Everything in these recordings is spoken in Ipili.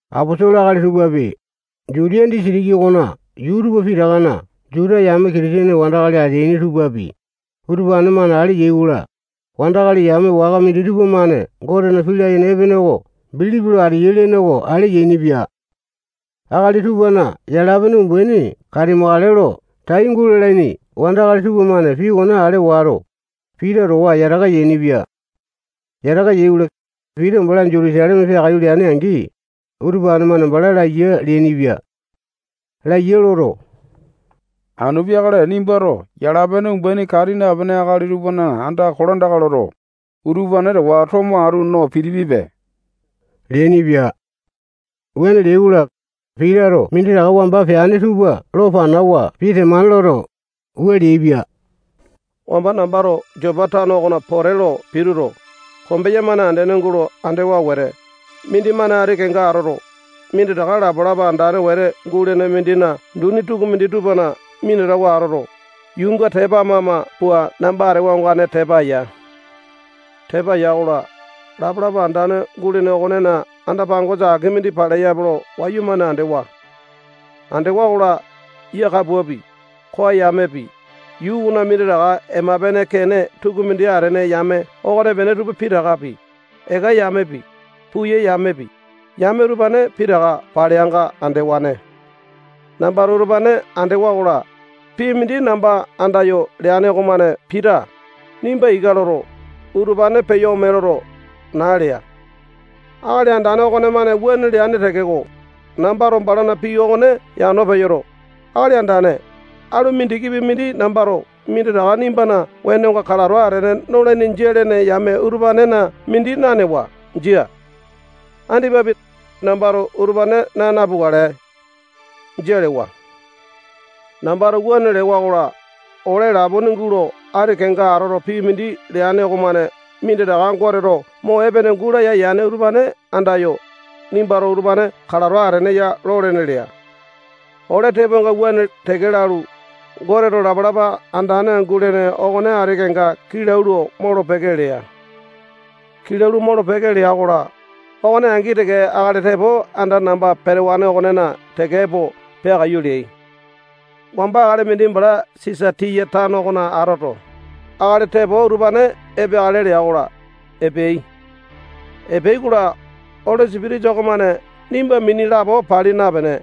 Aposolo akali tupapi, Jutiya disitiki okona yuu tupa pitakana Juta yame Kitisene wandakali ateaini tupapi, utupane-mane ale yai-kola, wandakali yame waka minditupa-mane Gotena pii layene epene oko bilipi lo ateyai lene oko ale yainipia. Akali tupana yala-pene umbaini katimakale lo tai gulalaini wandakali tupamane pii okone ale wato, Pita towa yataka yainipia. Yataka yai-kola, Pita bala Jutusaleme peakaiyu leane-angi, utupane-mane bala laiya leainipia. Laiya loto, anu peakale nimbato yala-pene umbaini kati napene akali tupana andaka kolandaka loto, utupane towa atu tomo no pitipipe leainipia. Wuane leai-kola, Pitato minditaka wamba peane tupa lo panawa pii temane loto, wua leaipia: Wamba nambato Jopa tano okona pote lo pituto, kombeya-mane andene gulo andewa wete, mindimane ati kenga atoto, minditaka lapalapa andane wete gulene mindina duni tukumindi tupana minatawa atoto, yuunga tepa ama-ama pua namba atewa ongane tepa ya. Tepa ya-kola, lapalapa andane gulene okonena anda-pangosa aki mindi paleyape lo wayumane andewa. Andewa-kola, yia kapuapi, koa yamepi, yuu okona minditaka ema-pene kene tukumindi atene yame okonepene tupa pitakapi, eka yamepi, puya yamepi, yame utupane pitaka paleanga andewane. Nambato utupane andewa-kola, pii mindi namba andayo leane okomane Pita, nimba ika loto, utupane peyo ome loto, naa lea. Akali Andane okomane wuane leane tekeko, nambato balana pii okone yano peyoto, Akali Andane, alu mindikipi mindi nambato minditaka nimbana wenonga kalato atene nolaini jia lene yame utupanena mindi nanewa. Jia. Andipapi, nambato utupane naa napukale. Jia lewa. Nambato wuane lewa-kola, ole lapone gulo ati kenga atoto pii mindi leane okomane minditaka Goteto mo epene gulaya yane utupane andayo, nimbato utupane kalato atene ya lolene lea. Ole tepoainga wuane teke lalu, Goteto lapalapa andane gulene okone ati kenga kilau lo molo-peke lea. Kilau lo molo-peke lea-kola, okone angi teke akali tepo anda namba petewane okonena teke epo peakaiyu leai. Wamba akali mindi bala Sisatiya tano okona atoto, akali tepo utupane epeakale lea-kola, epeai. Epeai-kola, Oli Sipitisa okomane nimba mini lapo pali napene,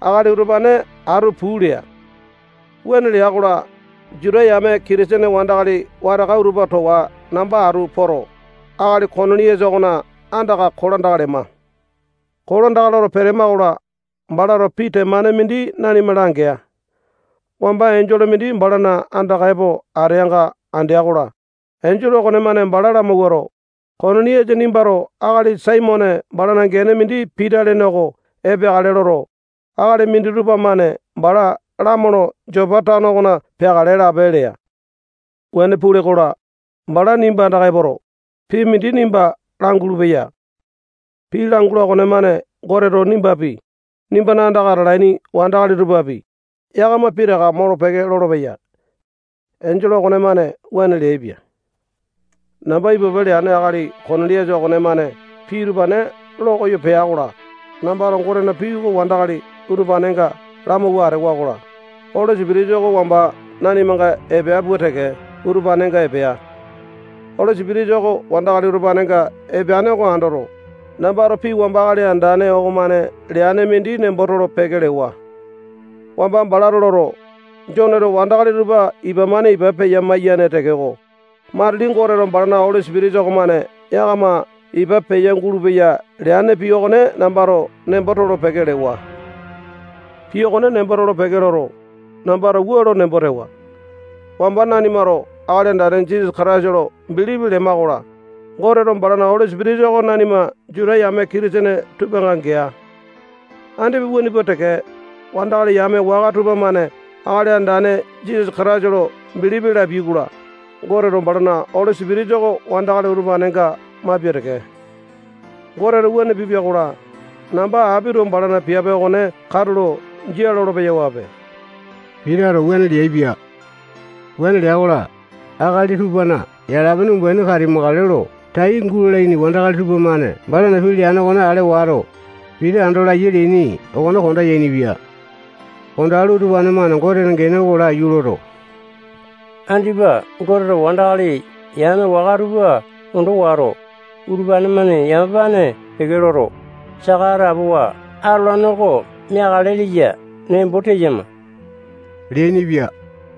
akali utupane atu puu lea. Wuane lea-kola, Juta yame Kitisene wandakali wataka utupa towa namba atu poto, akali Koniliasa okona andaka kolandaka lema. Kolandaka loto petema-kola, balato pii temane mindi nanima langea. Wamba enjole mindi balana andaka epo ateanga andea-kola, enjole okonemane bala lamawuato, Koniliasa nimbato akali Saimone balana gene mindi Pita lene oko epeakale loto, akali minditupa-mane bala lamolo Jopa tano okona peakale lape lea. Wuane pule-kola, bala nimba andaka epoto, pii mindi nimba langulu-peya. Pii langula okonemane Goteto nimbapi, nimbana andaka atalaini wandakali tupapi, yakama pitaka molo-peke lolopeya. Enjole okonemane wuane leaipia. Namba ipupe leane akali Koniliasa okomane pii utupane lokoyo pea-kola, nambato Gotena pii oko wandakali utupanenga lamawua atewa-kola, Oli Sipitisa oko wamba nanimanga epea pua teke, utupanenga epea. Oli Sipitisa oko wandakali utupanenga epeane oko andoto, nambato pii wamba Akali Andane okomane leane mindi nembo tolo-peke lewa. Wamba balato loto, Joneto wandakali tupa ipa-mane ipa peya-maiyane tekeko, matili Goteto balana Oli Sipitisa okomane yakama ipa peya-gulupeya leane pii okone nambato nembo tolo-peke lewa. Pii okone nembo tolo-peke loto, nambato wua lo nembo tewa: Wamba nanimato Akali Andane Jisasa Kataisa lo bilipi lema-kola, Goteto balana Oli Sipitisa oko nanima Juta yame Kitisene tupanga gea. Andipa wuane pua teke, wandakali yame waka tupamane Akali Andane Jisasa Kataisa lo bilipi lapiai-kola, Goteto balana Oli Sipitisa oko wandakali utupanenga maipia teke. Goteto wuane pipia-kola, namba apito balana piape okone katulo jia lolo-peyawape. Pitato wuane leaipia. Wuane lea-kola, akali tupana yala-pene umbaini katimakale lo tai gulalaini wandakali tupamane balana pii leane okone ale wato, Pita ando laiya leaini okone konda yainipia. Kondalu, utupane-mane Gotena gene oko laiyu loto, andipa Goteto wandakali yame waka tupa ondo wato, utupane-mane yamapane peke loto, saka atapowa atolane oko meakale leya nembo teyama leainipia.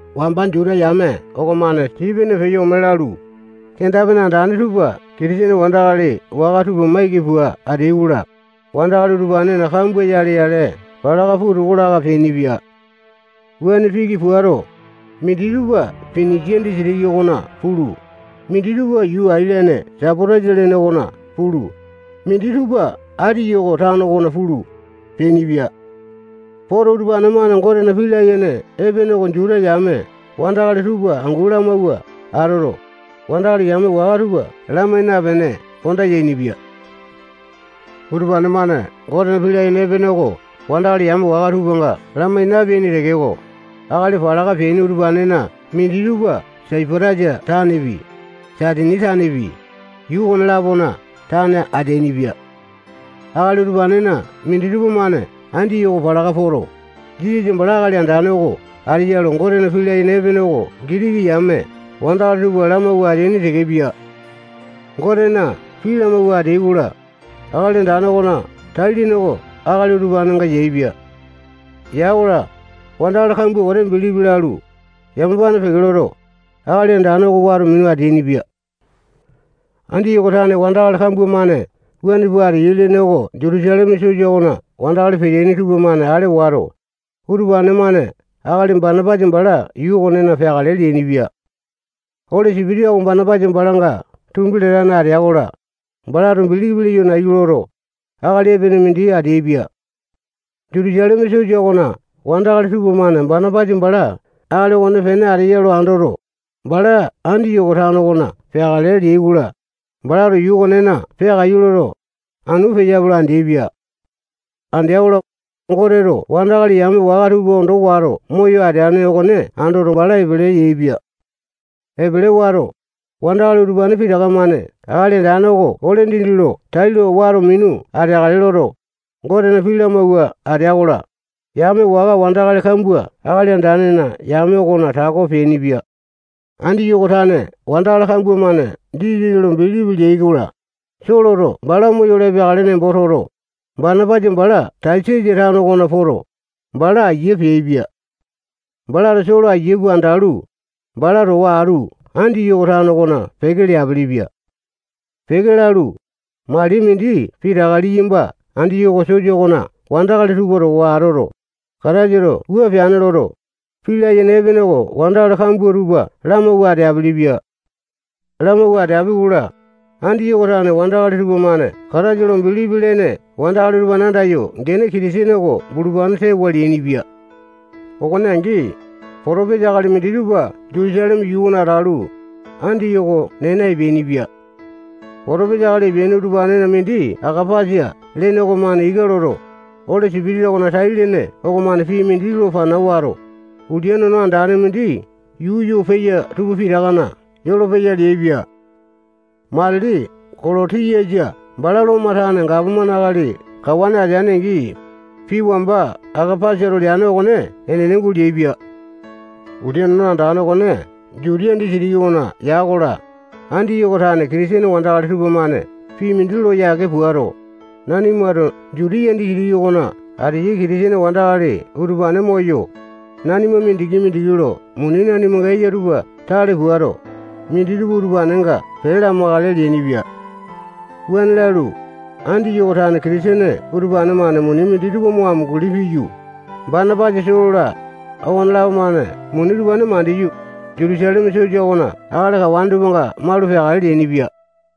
Wamba Juta yame okomane Sipene peyo ome lalu, kenda-pene andane tupa Kitisene wandakali waka tupa maiki pua ateai-kola, wandakali utupanena kambua yale-yale palaka puu toko laka peainipia. Wuane piki puato, minditupa Pinisia disitiki okona pulu, minditupa yuu ailene Saipatasa lene okona pulu, minditupa Andiyoko tano okona pulu, peainipia. Poto, utupane-mane Gotena pii layene epene oko Juta yame wandakali tupa angu lamawua atoto, wandakali yame waka tupa lamai napene konda yainipia. Utupane-mane Gotena pii layene epene oko wandakali yame waka tupanga lamai napeaini tekeko, akali palaka peaini utupanena minditupa Saipatasa tanepi, Saitini tanepi, yuu okone-lapona tane ateainipia. Akali utupanena minditupa-mane Andiyoko palaka poto, Jisasa bala Akali Andane oko ateya lo Gotena pii layene epene oko Gitiki yame wandakali tupa lamawua ateaini tekepia. Gotena pii lamawua ateai-kola, Akali Andane okona tai-lene oko akali utupanenga yaepia. Ya-kola, wandakali kambua wete bilipi lalu, yamapane peke loto, Akali Andane oko wato minu ateainipia. Andiyoko tane wandakali kambua-mane wuane pua ateyai lene oko Jutusaleme sosa okona wandakali peteaini tupamane ale wato, utupane-mane akali Banapasa bala yuu okonena peakale leainipia. Oli Sipitisa oko Banapasa balanga tumbi latane atea-kola, balato bilipi leyo nayu loto, akali epene mindi ateaipia. Jutusaleme sosa okona wandakali tupamane Banapasa bala akali okonepene ateya lo andoto, bala Andiyoko tano okona peakale leai-kola, balato yuu okonena peakaiyu loto, anu peyape lo andeaipia. Andea-kola, Goteto wandakali yame waka tupa ondo wato moyo ateane okone andoto, bala epele yaepia. Epele wato, wandakali utupane pitaka-mane Akali Andane oko ole dindi lo tailo wato minu ateakale loto, Gotena pii lamawua atea-kola, yame waka wandakali kambua Akali Andanena yame okona tako peainipia. Andiyoko tane wandakali kambua-mane Jisasa lo bilipi leai-kola, Soloto bala moyolo epeakale nembo toto, Banapasa bala Tasasa tano okona poto, bala aiya peaipia. Balato Solo aiya pua andalu, bala towa atu Andiyoko tano okona peke leapilipia. Peke lalu, mali mindi pitaka liyamba Andiyoko sosa okona wandakali tupa towa atoto, Kataisato wua peane loto, pii layene epene oko wandakali kambua tupa lamawua ateapili-pia. Lamawua ateapi-kola, Andiyoko tane wandakali tupamane Kataisa lo bilipi lene wandakali utupane andayo gene Kitisene oko bulupane tewa leainipia. Okone angi, potopesa akali minditupa Jutusaleme yuu okona atalu, Andiyoko nena epeainipia. Potopesa akali epeaini utupanena mindi Akapasa lene okomane ika loto, Oli Sipitisa okona tai-lene okomane pii mindi lo pana wato, ulia nono andane mindi yuu yo peya tupa pitakana yolopeya leaipia. Matili Kolotiyasa bala Lomo tane gapomane akali kawane atea-angi, pii wamba Akapasato leane okone enene guleaipia. Ulia nono andane okone Jutiya disitiki okona ya-kola, Andiyoko tane Kitisene wandakali tupamane pii mindi lo yake puato, nanimato Jutiya disitiki okona ateyai Kitisene wandakali utupane moyo, nanima mindiki-mindiki lo muni nanimanga eya tupa tale puato, minditupa utupanenga pee lamakale leainipia. Wuane lalu, Andiyoko tane Kitisene utupane-mane muni minditupa mo amunguli piyu, Banapasa, Solo-la, okonelapo-mane muni utupane mandiyu, Jutusaleme Sosa okona akali kawane tupanga malu peakale leainipia.